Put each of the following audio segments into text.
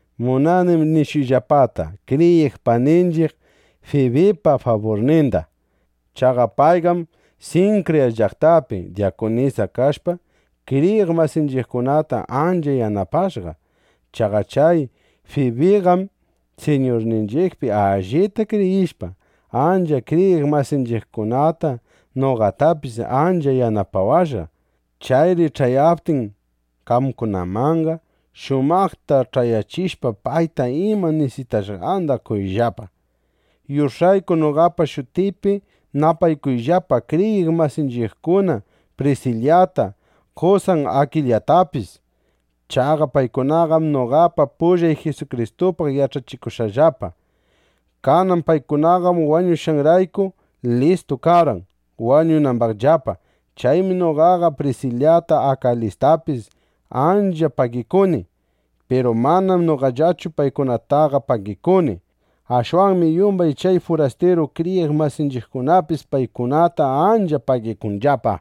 Munanim nishuyllapata kriyiq paninchiq Fibipa faburninda. Chaqa payqam Sinkriya llaqtapi dyakunisa kashpa, kriyiq masinchiqkunata ancha yanapashqa. Chaqa chay Fibiqam Siñurninchiqpi allita kriyishpa, achka kriyiq masinchiqkunata, noqatapis ancha yanapawashqa. Chayri ch'ayaptin qamkunamanqa, shumaqta ch'ayachishpa, payta ima nisitashqanda qoyllapa. Yush'ayku noqapa shutiypi napaykuyllapa kriyiq masinchiqkuna Prisilata, qosan Akilastapis. Chaqa paykunaqam noqapa pullay Jisukristupaq yach'achikushqallapa. Kanan paykunaqam washawananrayku, listu karqan, wañunambaqllapa. Chaymi noqaqa Prisilata Akilastapis ancha pagikuni. Piru manam noqallachu paykunataqa pagikuni. Ashwanmi yumbay chay furastiru kriyiq masinchiqkunapis paykunata ancha pagikunllapa.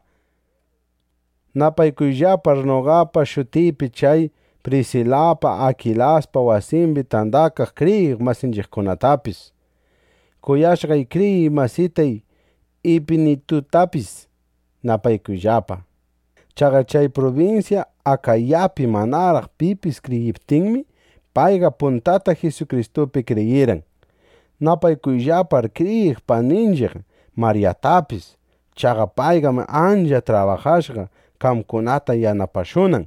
Napaykuyllapar noqapa shutiypi chay Prisilapa Akilaspa wasimbi tandakaq kriyiq masinchiqkunatapis. Kuyashqay kriyiq masitay Ipinitutapis napaykuyllapa. Chaqa chay prubinsya Akayapi manaraq pipis kriyiptinmi, payqa puntata Jisukristupi kriyirqan. Napaykuyllapar kriyiq paninchiq Maryatapis. Chaqa payqam ancha trabajashqa, qamkunata yanapashunan.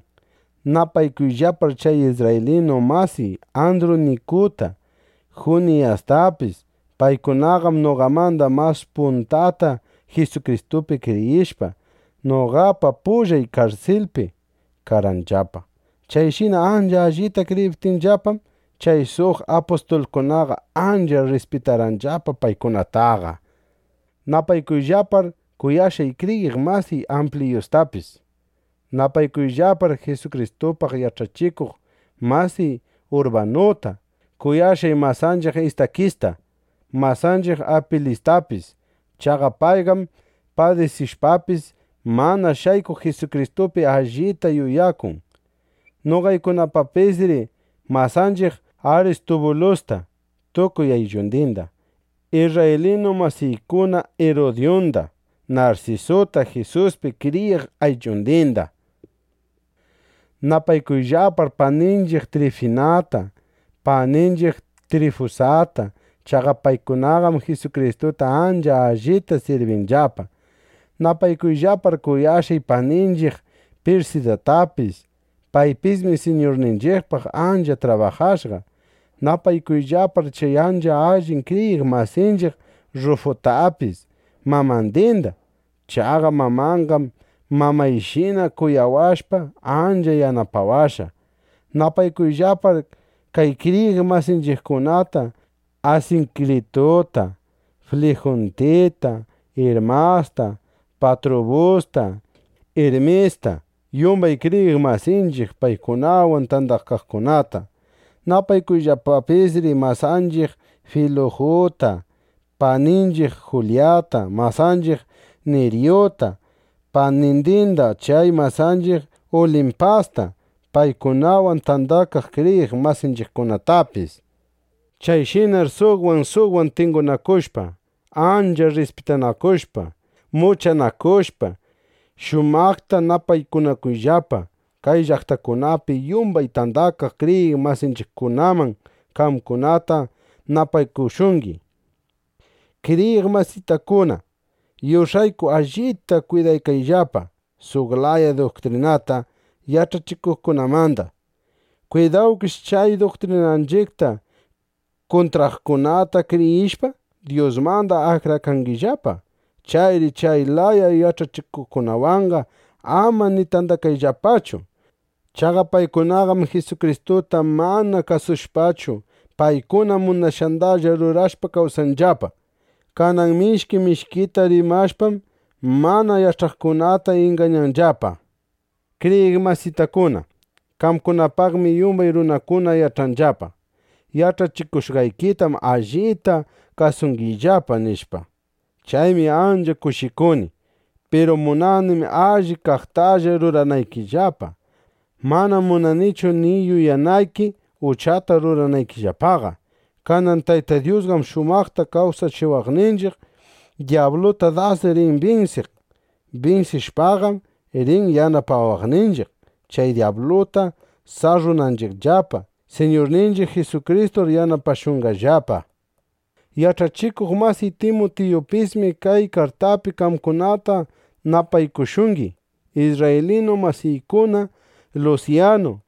Napaykuyllapar chay isrraylinu masiy Andrunikuta, Juniyastapis. Paykunaqam noqamanda mas puntata Jisukristupi kriyishpa, noqapa pullay karsilpi karqanllapa. Chayshina ancha allita kriyiptinllapam, chay suq apustulkunaqa ancha rrispitanllapa paykunataqa. Napaykuyllapar kuyashqay kriyiq masiy Ampliyustapis. Napaykuyllapar Jisukristupaq yach'achikuq masiy Urbanuta, kuyashqay masanchiq Istakista, masanchiq Apilistapis. Chaqa payqam padisishpapis, mana shaykuq Jisukristupi allita yuyakun. Napaykuyllapapisri masanchiq Aristubulusta tukuy ayllundinda, isrraylinu masiykuna Irudyunda, Narsisuta Jisuspi kriyiq ayllundinda. Napaykuyllapar paninchiq Trifinata, paninchiq Trifusata. Chaqa paykunaqam Jisukristuta ancha allita sirbinllapa. Napaykuyllapar kuyashqay paninchiq Pirsidatapis. Paypismi Siñurninchiqpaq ancha trabajashqa. Napaykuyllapar chay ancha allin kriyiq masinchiq Rrufutapis, mamandinda. Chaqa mamanqam mamayshina kuyawashpa, ancha yanapawashqa. Napaykuyllapar kay kriyiq masinchiqkunata: Asinkrituta, Fliguntita, Irmasta, Patrubusta, Irmista, yumbay kriyiq masinchiq paykunawan tandakaqkunata. Napaykuyllapapisri masanchiq Filuguta, paninchiq Julyata, masanchiq Niryuta, panindinda, chay masanchiq Ulimpasta, paykunawan tandakaq kriyiq masinchiqkunatapis. Chayshinar suqwan suqwan tingunakushpa, (ancha rrispitanakushpa) muchanakushpa, shumaqta napaykunakuyllapa. Kay llaqtakunapi yumbay tandakaq kriyiq masinchiqkunam qamkunata napaykushungi. Kriyiq masitakuna, yush'ayku allita kwidakayllapa suq laya duktrinata yach'achikuqkunamanda. Kwidawkish, chay duktrinanchiqta kuntraqkunata kriyishpa, Dyusmanda akrakangimanllapa. Chayri chay laya yach'achikuqwanqa ama ni tandakayllapachu. Chaqa paykunaqam Jisukristuta mana kasushpachu, paykuna munashqandalla rurashpa kawsanllapa. Kanan mishki mishkita rimashpam, mana yach'aqkunata ingañanllapa. Kriyiq masitakuna, qamkunapaqmi yumbay runakuna yach'anllapa: Yach'akushqaykitam allita kasungillapa, nishpa. Chaymi ancha kushikuni. Piru munanim alli kaqtalla ruranaykillapa. Manam munanichu ni yuyanayki, uchata ruranaykillapaqa. Kanan Tayta Dyusqam shumaqta kawsachiwaqninchiq, dyabluta das rin binsiq. Binsishpaqam, rin yanapawaqninchiq, chay dyabluta sarrunanchiqllapa. Siñurninchiq Jisukristur yanapashunqallapa. Yach'achikuq masiy Timutiyupismi kay kartapi qamkunata napaykushungi. Isrraylinu masiykuna Lusyanu,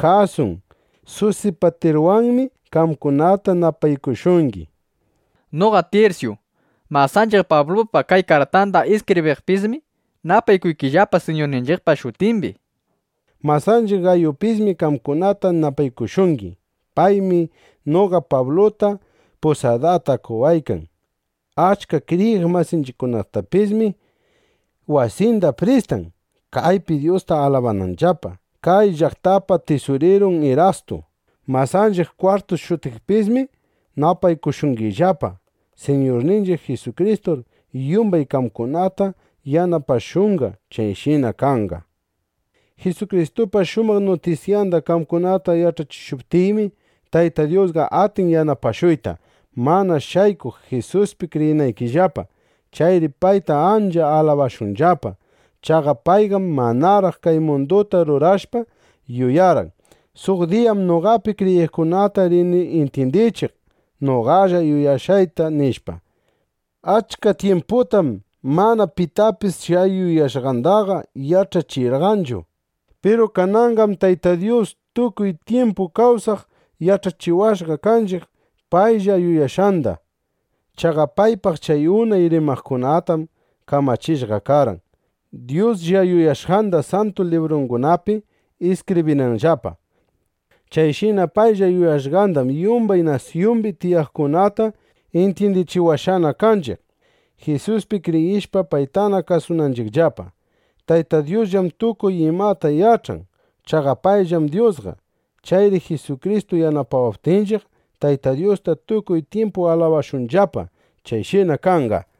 Jasun, Susipatirwanmi qamkunata napaykushungi. Noqa Tirsyu, masanchiq Pablupa kay kartanda iskibriqpismi napaykuykillapa Siñurninchiqpa shutimbi. Masanchiq Gayupismi qamkunata napaykushungi. Paymi noqa Pabluta pusadata qowaykan. Achka kriyiq masinchiqtapismi wasinda pristan, kaypi Dyusta alabananllapa. Kay llaqtapa tisurirun Irastu, masanchiq Kwartu shutiqpismi napaykushungillapa. ˻ Siñurninchiq Jisukristur yumbay qamkunata yanapashunqa. Chayshina kanqa.˼ Jisukristupa shumaq nutisyanda qamkunata yach'achishuptiymi, Tayta Dyusqa atin yanapashuyta, mana shaykuq Jisuspi kriyinaykillapa. Chayri payta ancha alabashunllapa. Chaqa payqam manaraq kay munduta rurashpa, yuyarqan: Suq diyam noqapi kriyiqkunata rini intyindichiq noqalla yuyashqayta, nishpa. Achka tyimputam mana pitapis chay yuyashqandaqa yach'achirqanchu. Piru kananqam Tayta Dyus tukuy tyimpu kawsaq yach'achiwashqa kanchiq paylla yuyashqanda. Chaqa paypaq chay unay rimaqkunatam kamachishqa karqan, Dyuslla yuyashqanda Santu Librungunapi iskibrinanllapa. Chayshina paylla yuyashqandam yumbay nasyumbi tiyaqkunata intyindichiwashqana kanchiq, Jisuspi kriyishpa, paytana kasunanchiqllapa. Tayta Dyusllam tukuy imata yach'an. Chaqa payllam Dyusqa. Chayri Jisukristu yanapawaptinchiq, Tayta Dyusta tukuy tyimpu alabashunllapa. ¡Chayshina kanqa!